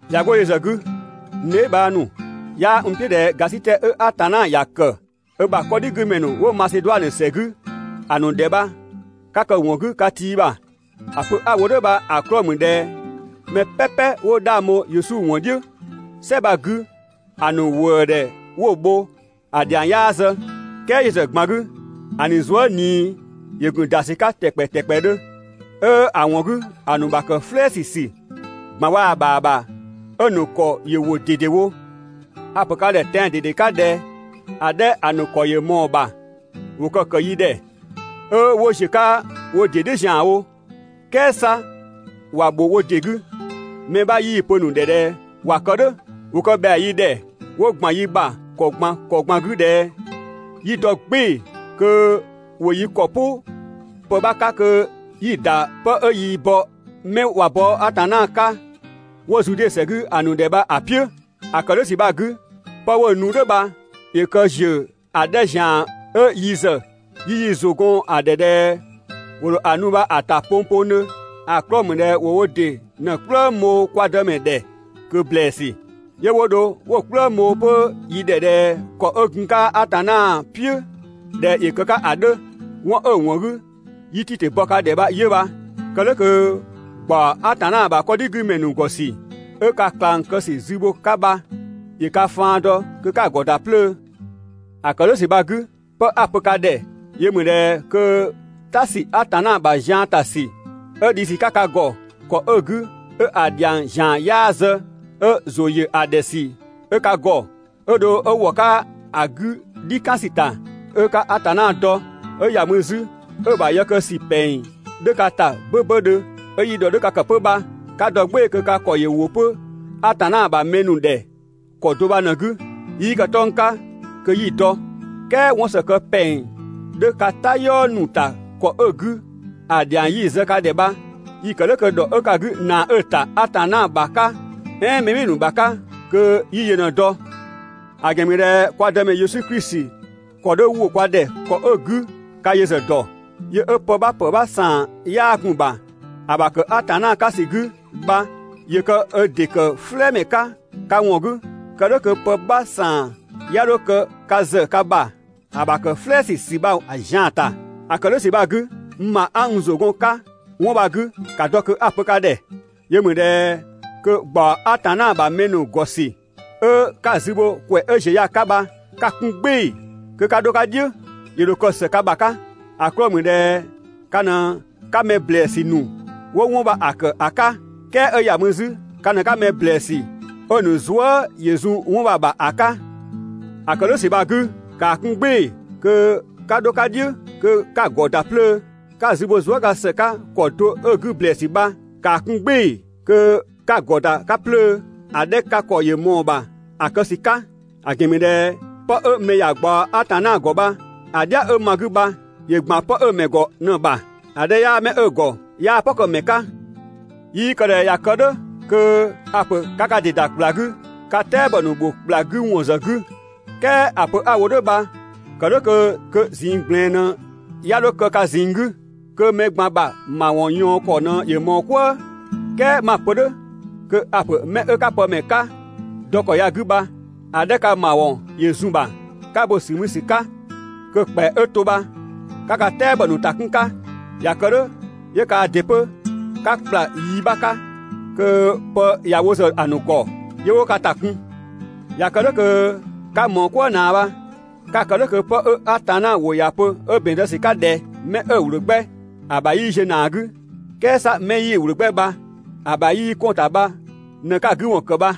꞊Ya 'go yö ‑zë 'gü, n dheebhang ‑nu, 'yaa n "piʋ̈ ꞊dhɛ ‑gasitɛ 'ö Atanna ‑ya ‑kë ö ‑bha 'kɔdhigümɛ ‑nu 'wo Maseduanö ‑sɛ 'gü ‑a ‑nu ‑dhɛ bha ka kë‑ ‑wɔn 'gü ka tii ‑bha. ‑A pö 'a‑ wo "dhʋ̈ bha‑ 'klɔɔ‑ ‑mü ꞊dhɛ mɛ "pɛpɛ 'wo 'dhang bho Yesu ‑wɔn "dhiʋ̈ "sɛ bha‑ 'gü ‑a ‑nu ‑wëëdhɛ 'wo‑ bho, ‑a ‑dhiang 'yaa zë. "Kɛɛ yö ‑zë ꞊gban 'gü, ‑a ‑nu zuë" ‑yö ‑gun ‑da ‑sü 'ka ‑tɛkpɛ ‑tɛkpɛdhö, 'ö‑ ‑wɔn 'gü ‑a ‑nu ‑bha ‑kë "flɛɛsü ‑sü ꞊gban waa‑ ‑bha ‑bha, 'ö‑ ‑nu ‑kɔ ‑yö ‑wo ꞊dedewo. A‑ ‑pö ka ‑dhɛ tɛan‑ ꞊dede 'ka ꞊dhɛ ‑a 'dhɛ ‑a ‑nu ‑kɔ ‑yö ꞊mɔɔ‑ ‑bha ‑wo kë‑ ‑kë yi ‑dhɛ, 'ö 'wo ‑ziö 'ka wo ‑dɩ "dhiʋ̈ ‑zianwo, "kɛɛ 'sa ‑wa ‑bho wo ‑dɩ 'gü, mɛ 'bha 'yii‑ pö‑ ‑nu ‑dhɛ ꞊dhɛ ‑wa kë "dhʋ̈. ‑Wo kë ‑bhɛa yi ‑dhɛ 'wo ‑gban yi ‑bha ‑kɔ ꞊gban ‑kɔ ꞊gban 'gü ꞊dhɛ, 'yi dɔ "gbɩɩ‑ kö 'wo yi ‑kɔ "pʋ pë 'bha 'ka kö 'yi‑ ‑da 'pë 'ö yii‑ bɔ 'mɛ ꞊wa bɔ Atanna 'ka 'wo Zude ‑sɛ 'gü‑ ‑nu ‑dhɛ bha‑ "piʋ̈. ‑A ‑kë "dhʋ̈ ‑sü bha‑ 'gü, 'pë 'wo‑ nu "dhʋ̈ bha ‑yö kë ‑ziö ‑a 'dhɛ ‑zian 'ö yi ‑zë yi ‑zʋ gun‑ ‑bha ꞊dhɛ ‑wo ‑dho ‑a ‑nu bha‑ ‑ta pongpongdhö, ‑a 'klɔɔ‑ ‑mü ꞊dhɛ ‑wo wo ‑dɩ ꞊në‑ "kplëng bho kwa Dëmɛ ‑dhɛ ꞊kö ‑blɛɛsü, 'yö 'wo dho 'wo‑ "kplëng bho 'pö yi ‑dhɛ ꞊dhɛ ‑kɔ 'ö gun‑ 'ka Atanna "piʋ̈ ꞊dhɛ ‑yö kë‑ 'ka ‑a 'dhö. 'Wɔn 'ö‑ ‑wɔn 'gü 'yi Titö bɔ ka ‑dhɛ bha 'yö bha. Kë "dhʋ̈ kö ‑gbaɔ Atanna ‑bha 'kɔdhigümɛ ‑nu ‑gɔ ‑sü 'ö ka ꞊klang kë ‑sü zü bho‑ 'ka bha ‑yö ka faan dɔ kö 'ka‑ ‑gɔ ‑da 'plöö. ‑A ‑kë "dhʋ̈ ‑sü bha‑ 'gü, 'pë 'a‑ pö ka ‑dhɛ yö ‑mü ꞊dhɛ kö "ta ‑sü Atanna ‑bha zian ‑ta ‑sü 'ö dhi ‑sü 'ka ka ‑gɔ ‑kɔ 'ö‑ 'gü 'ö‑ ‑dhiang ‑zian 'yaa zë, 'ö ‑zʋ ‑yö ‑a ‑dhɛ ‑sü 'ö ka ‑gɔ, 'ö dho 'ö ‑wɔ 'ka ‑a 'gü "dhi kan ‑sü ‑ta, 'ö 'ka Atanna dɔ ‑kɔ ꞊gban ‑kɔ ꞊gban 'gü, 'ö ‑ya mü 'zü 'ö‑ ‑bha yë kë ‑sü ‑pɛng 'dhö ka ‑ta 'böbödhö, 'ö yi ‑dhɔ 'dhö ka ‑kë 'pö bha 'ka dɔ "gbɩɩ‑ kö ka ‑kɔ ‑yö ‑wo 'pö Atanna ‑bha mɛ ‑nu ‑dhɛ ‑kɔ do bha ꞊në‑ 'gü. 'Yii kë 'tɔng‑ 'ka kö 'yi‑ dɔ, "kɛɛ 'wɔnsë kë ‑pɛng 'dhö ka "tayɔɔ ‑nu ‑ta ‑kɔ 'ö‑ 'gü ‑a ‑dhiang 'yi‑ zë ka ‑dhɛ bha, 'yi‑ kë "dhʋ̈ kö ‑dhɔ 'ö ka 'gü ‑naa 'ö‑ ‑ta Atanna ‑bha 'ka, "ɛɛn mɛ ‑nu ‑bha 'ka kö 'yi yö ꞊në‑ dɔ. ‑A ‑gɛn ‑mü ꞊dhɛ kwa Dëmɛ Yesu Klisi ‑kɔ 'dhö ‑wo kwa ‑dhɛ ‑kɔ 'ö‑ 'gü ka yö ‑zë ‑dɔ. Yö 'ö pë 'bha ‑pë 'bha ‑saan 'yaa gun‑ ‑bha (‑a ‑bha ‑kë Atanna 'ka ‑sü 'gü) bha ‑yö kë ö ‑dɩ ‑kë "flɛɛmɛ 'ka ka ‑wɔn 'gü, kë "dhʋ̈ kö pë 'bha ‑saan 'ya 'dho kë ka ‑zë ka bha‑ ‑bha ‑kë "flɛɛsü ‑sü bha‑ zian‑ ‑ta. ‑A ‑kë "dhʋ̈ ‑sü bha‑ 'gü, n ‑bha 'a n ‑zʋ gɔn‑ 'ka 'wɔn bha‑ 'gü ‑ka dɔ kö 'a‑ pö ka ‑dhɛ: Yö ‑mü ꞊dhɛ kö ‑gbaɔ Atanna ‑bha mɛ ‑nu ‑gɔ ‑sü 'ö 'ka‑ zü bho ‑kwɛ 'ö ‑ziö ya‑ 'ka bha 'ka‑ 'kun "gbɩɩ‑ kö 'ka 'dho‑ 'ka "dhiʋ̈. ‑Yö ‑dho kë ‑së ka ‑bha 'ka. ‑A 'klɔɔ‑ ‑mü ꞊dhɛ ka ꞊në 'ka mɛ ‑blɛɛsü ‑nu 'wo 'wɔn bha‑ ‑kë ‑a 'ka, "kɛɛ 'ö ‑ya mü 'zü ka ꞊në 'ka mɛ ‑blɛɛsü 'ö‑ ‑nu zuë" ‑yö zun 'wɔn bha‑ ‑bha ‑a 'ka. ‑A ‑kë "dhʋ̈ ‑sü bha‑ 'gü, ‑kaa 'kun "gbɩɩ‑ kö 'ka 'dho‑ 'ka "dhiʋ̈ kö 'ka‑ ‑gɔ ‑da 'plöö‑. 'Ka‑ zü bho zuëga ‑së 'ka ‑kɔ do 'ö‑ 'gü ‑blɛɛsü bha, ‑kaa 'kun "gbɩɩ‑ kö 'ka‑ ‑gɔ ‑da 'ka 'plöö ‑a 'dhɛ ka ‑kɔ ‑yö ꞊mɔɔ‑ ‑bha ‑a kë ‑sü 'ka. ‑A ‑gɛn ‑mü ꞊dhɛ 'pë 'ö mɛ ‑ya ꞊gbaɔ Atanna ‑gɔ bha‑ "dhia 'ö ma‑ 'gü bha ‑yö ‑gban 'pë 'ö‑ ‑mɛ ‑gɔ ꞊në‑ ‑bha. ‑A 'dhɛ 'yaa 'mɛ 'ö‑ ‑gɔ 'yaa‑ "pɔ kë‑ ‑mɛ "dhiʋ̈. 'Yii kë ꞊dhɛ ꞊ya kë "dhʋ̈ kö a‑ ‑pö 'ka ka ‑dɩ ‑da ‑kpla 'gü ka "tɛabɔ ‑nu ‑bho ‑kpla 'gü ‑wɔn ‑zë 'gü. "Kɛɛ ‑a pö 'a‑ wo "dhʋ̈ bha kë "dhʋ̈ kö ꞊zinng ꞊gblɛɛn ꞊në 'ya 'dho kë ka ꞊zinng 'gü, kö mɛ ꞊gban ‑bha ‑mawɔn ꞊yaɔn ‑kɔ ꞊në ‑yö ꞊mɔɔ "kwëë. "Kɛɛ 'ma‑ pö "dhʋ̈ kö a‑ ‑pö 'mɛ 'ö 'ka pë ‑mɛ 'ka dɔ ‑kɔ ya‑ 'gü bha, ‑a 'dhɛ ka ‑mawɔn ‑yö zun‑ ‑bha 'ka bo‑ ‑sü mü ‑sü 'ka, kö‑ ‑kpɛa 'ö to bha 'ka ka "tɛabɔ ‑nu ‑ta 'kun‑ 'ka. ꞊Ya kë "dhʋ̈ 'yö kaa ‑dɩ 'pö 'ka ‑kpla yi 'bha 'ka kö pë ‑ya wo ‑zë ‑a ‑nu ‑gɔ, 'yö 'wo ka ‑ta kun, ꞊ya kë "dhʋ̈ kö 'ka ꞊mɔɔ "kwëë ꞊naa bha. 'Ka‑ kë "dhʋ̈ kö 'pë 'ö Atanna ‑wʋ ‑ya pö 'ö ‑bɛn zë ‑sü 'ka ꞊dhɛ: «'Mɛ 'ö‑ ‑wlö 'gbɛ ‑a ‑bha 'yii ziö ‑naa 'gü, "kɛɛ 'sa mɛ 'yii‑ ‑wlö 'gbɛ bha‑ ‑bha 'yii 'kɔn‑ ‑ta bha ꞊në 'ka‑ 'gü ‑wɔn ‑kë bha.»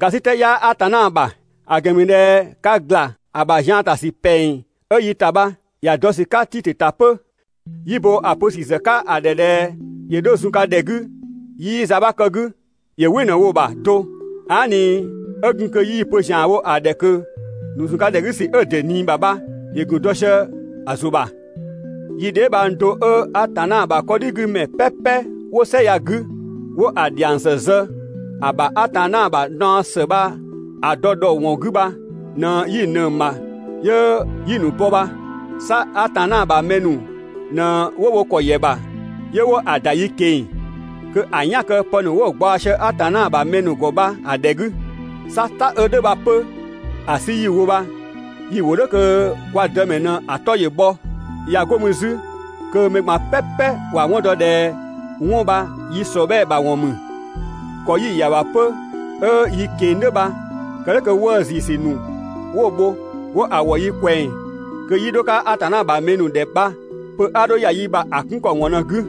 ‑Gasitɛ 'yaa Atanna ‑bha, ‑a ‑gɛn ‑mü ꞊dhɛ ka ‑gla ‑a ‑bha zian ‑ta ‑sü ‑pɛng 'ö yi ‑ta bha ‑ya dɔ ‑sü 'ka Titö ‑ta 'pö. 'Yi bo‑ pö ‑sü ‑zë 'ka‑ ‑dhɛ ꞊dhɛ ‑yö 'dho zun ka ‑dhɛ 'gü 'yii za 'bha kë‑ 'gü, ‑yö "wɩ ꞊në‑ 'wo‑ ‑bha do. Aa" ꞊ni 'ö gun kö 'yii‑ pö ‑zian wo‑ ‑dhɛ ꞊kö, ‑nu zun ka ‑dhɛ 'gü ‑sü 'ö‑ ‑dɩ ꞊nii ‑bha bha ‑yö ‑gun dɔ sië‑ ‑zʋ ‑bha. Yi dheebhang do 'ö Atanna ‑bha 'kɔdhigümɛ "pɛpɛ 'wo "sɛ ya‑ 'gü 'wo‑ ‑dhiang ‑së zë ‑a ‑bha Atanna ‑bha naɔ ‑së bha‑ dɔ ‑dhɔ ‑wɔn 'gü bha ꞊në 'yi‑ ꞊nëng‑ ‑bha 'yö 'yi‑ ‑nu bɔ bha. 'Sa Atanna ‑bha mɛ ‑nu ꞊në 'wo wo ‑kɔ ‑yɛ ‑bha 'yö 'wo‑ ‑da yi keng‑ kö‑ "yan‑ kë pë ‑nu 'wo‑ ꞊gbaɔ sië Atanna ‑bha mɛ ‑nu ‑gɔ bha‑ ‑dhɛ 'gü. 'Sa "ta 'ö "dhʋ̈ bha 'pö‑ 'sü 'yi‑ wo bha, yi‑ ‑wo "dhʋ̈ kö kwa Dëmɛ ꞊në‑ 'tɔ ‑yö bhɔ, ꞊ya 'go mü 'zü kö mɛ ꞊gban "pɛpɛ ‑wa 'wɔn dɔ ꞊dhɛ 'wɔn bha yi ‑sɔbhɛɛ ‑bha ‑wɔn ‑mü. ‑Kɔ 'yi‑ ‑ya ‑bha 'pö 'ö yi keng‑ "dhʋ̈ bha kë "dhʋ̈ kö 'wëë ‑zii ‑sü ‑nu 'wo‑ bho 'wo‑ ‑wɔ yi ꞊kwɛng kö 'yi 'dho‑ 'ka Atanna ‑bha mɛ ‑nu ‑dhɛ bha, pö 'a 'dho ‑ya yi ‑bha ‑a 'kun ‑kɔ ‑wɔn ꞊në‑ 'gü.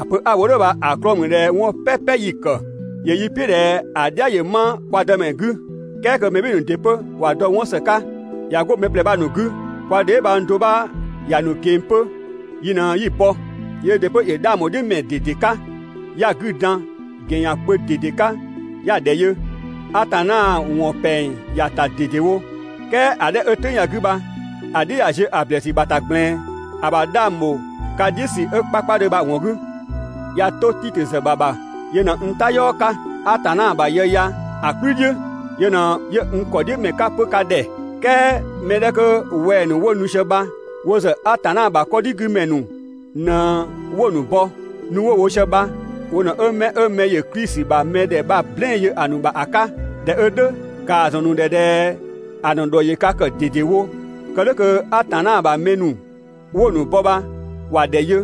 ‑A pö 'a‑ wo "dhʋ̈ bha‑ 'klɔɔ‑ ‑mü ꞊dhɛ 'wɔn "pɛpɛ 'yi‑ kë, ‑yö yi "piʋ̈ ꞊dhɛ ‑a "dhia ‑yö 'ma kwa Dëmɛ 'gü, "kɛɛ kö mɛ ‑nu ‑dɩ 'pö ‑wa dɔ 'wɔn ‑së 'ka. ꞊Ya 'go mɛ ꞊plɛ bha‑ ‑nu 'gü, kwa dheebhang do 'bha ‑ya ‑nu keng‑ 'pö, yi ꞊në 'yi‑ bɔ. Yöö ‑dɩ 'pö ‑yö 'dhang ‑bho "dhiʋ̈ ‑mɛ ꞊dede 'ka, 'ya‑ 'gü dan ‑gɛn ‑yan kpö ꞊dede 'ka 'ya‑ ‑dhɛ yö. Atanna ‑wɔn ‑pɛng ‑ya ‑ta ꞊dedewo. "Kɛɛ ‑a 'dhɛ 'ö "tʋ̈ng ya‑ 'gü bha‑ "dhiʋ̈ ꞊ya ziö ‑blɛɛsü ‑bha ‑ta ꞊gblɛɛn, ‑a ‑bha 'dhang ‑bho ka "dhiʋ̈ ‑sü 'ö 'kpakpadhö bha‑ ‑wɔn 'gü. ꞊Ya 'to Titö ‑zë ‑bha ‑bha, yö ꞊në n "tayɔɔ 'ka Atanna bha yë ya‑ "kplü "dhiʋ̈, 'yö n ‑kɔ "dhiʋ̈ nu ‑mɛ 'ka 'pö ka ‑dhɛ. "Kɛɛ mɛ 'dhɛ 'kö wɛng‑ ‑nu 'wo nu sië bha, wo ‑zë Atanna ‑bha 'kɔdhigümɛ ‑nu ꞊në 'wo‑ ‑nu ‑bɔ, nu 'wo‑ wo sië bha wo ꞊në 'wo 'mɛ 'ö mɛ ‑yö Klisi ‑bha mɛdhɛ bha‑ "blɛɛn‑ yö‑ ‑nu ‑bha ‑a 'ka. ꞊Dhɛ 'ö "dhʋ̈, ‑kaa ‑zɔn ‑nu ‑dhɛ ꞊dhɛ ‑a ‑nu ‑dhɔ ‑yö ka kë ꞊dedewo, kë "dhʋ̈ kö Atanna ‑bha mɛ ‑nu 'wo‑ ‑nu bɔ bha ‑wa ‑dhɛ yö,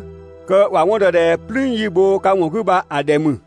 kö ‑wa 'wɔn dɔ ꞊dhɛ "plüün 'yi‑ bho ka ‑wɔn 'gü bha‑ ‑dhɛ ‑mü.